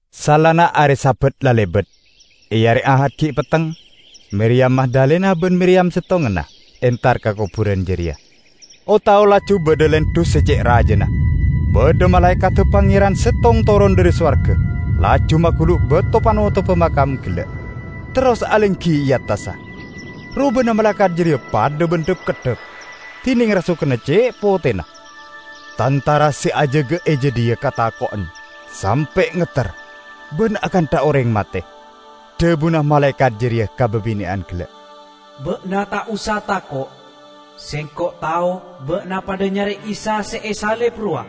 Saellana are Sabat la lebat, e are Ahad gi' petteng, Miriyam Magdalena ban Miriyam settonganna entar ka koburan jareya. O-tao laju badha lendhu se ce' rajana. Badha malaekadda Pangeran settong toron dhari sowarga laju magulu' bato panotobba makam gella', terros alenggi e attassa. Robana malaekat jareya padha ban dhap-keddhap, dineng rasoganna ce' potena. Tantara se ajaga e jadhiya katako'en sampe' ngetter, ban akantha oreng mate. Dhabuna malaekat jareya ka babine'an gella', "Ba'na ta' osa tako'! Sengko' tao ba'na padha nyare Isa se esalib rowa.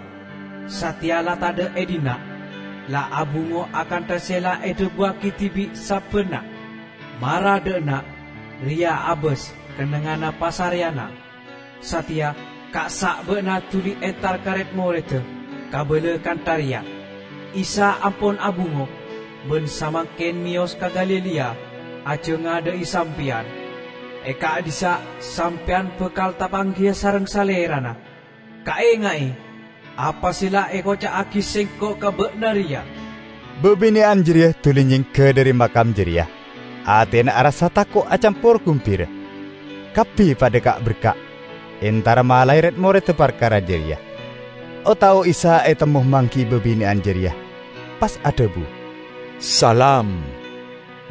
Sateya la tadha' e dhinna', la abungo akantha se la edhabuwagi dibi' sabbanna. Mara dha' enna', reya' abas kennengnganna pasareyanna. Sateya, kassa' ba'na duli entar ka red-moredda, kabala kantha reya, 'Isa ampon abungo, ban samangken meyos ka Galilea ajangadha'i sampeyan. E ka'dhissa' sampeyan bakal tapanggiya sareng Salerana!' Kaenga'e apa se la ekoca'agi sengko' ka ba'na reya." Babine'an jareya duli nyengga dhari makam jareya. Atena arassa tako' acampor gumbira, kabbi padha ka'-berka' entara malae red-moredda parkara jareya. O-tao Isa etemmo manggi'i babine'an jareya, pas adhabu, "Salam!"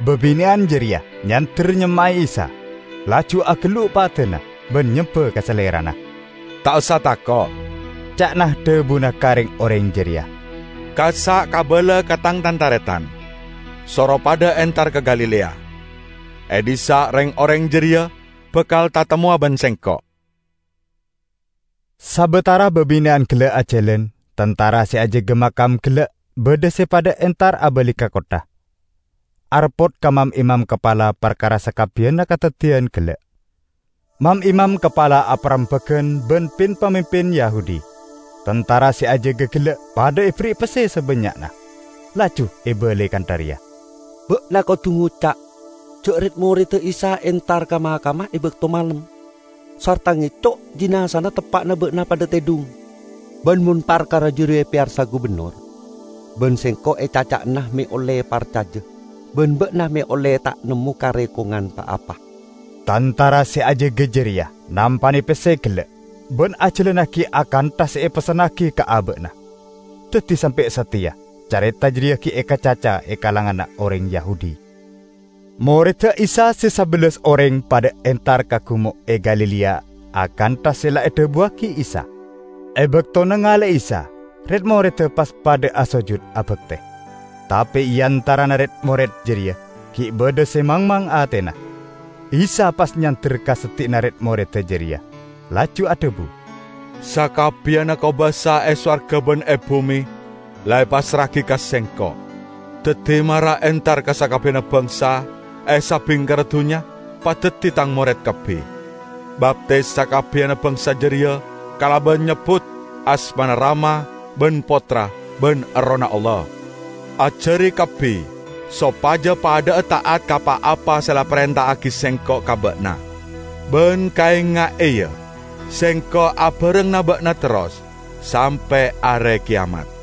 Babine'an jareya nyander nyemma'e Isa, laju agellu' padana ban nyemba ka Salerana. "Ta' osa tako'," ca'na dhabuna ka reng-oreng jareya, "kassa' kabala ka Tang tan-taretan, soro padha entar ka Galilea; e dhissa' reng-oreng jareya bakal tatemmowa ban Sengko'." Sabatara babine'an gella' ajalan, tantara se ajaga makam gella' badha se padha entar abali ka kottha, areppot ka mam-imam kapala parkara sakabbiyanna kadaddiyan gella'. Mam-imam kapala aparembagan ban pin-pamimpin Yahudi; tantara se ajaga gella' padha eberri'i pesse sabannya'na, laju ebalai kantha reya, "Ba'na kodu ngoca' ja' red-moredda Isa entar ka makamma e bakto malem, sarta ngeco' jinazana teppa'na ba'na padha tedhung. Ban mon parkara jareya epeyarsa gubennor, ban sengko' ecaca'ana me' olle parcaja ban ba'na me' olle ta' nemmo karekongan pa-apa." Tantara se ajaga jareya nampane pesse gella', ban ajalannagi akantha se epessennagi ka aba'na. Daddi sampe' sateya careta jareya gi' ekacaca e kalanganna oreng Yahudi. Moredda Isa se sabellas oreng padha entar ka gumo' e Galilea akantha se la edhabuwagi Isa. E bakto nangale'e Isa, red-moredda pas padha asojud abakte. Tape e antarana red-mored jareya gi' badha se mangmang atena. Isa pas nyander ka seddi'na red-moredda jareya, laju adhabu, "Sakabbiyanna kobasa e sowarga ban e bume la epassra'agi ka Sengko'. Daddi mara entar ka sakabbiyanna bangsa e sabingkerra dunnya, padaddi Tang mored kabbi. Baptis sakabbiyanna bangsa jareya kalaban nyebbut asmana Rama ban Pottra ban Errohna Allah. Ajari kabbi sopaja padha'a ta'at ka pa-apa se la eparenta'agi Sengko' ka ba'na. Ban kaenga'e, ya, Sengko' abarengngana ba'na terros sampe' are keyamat."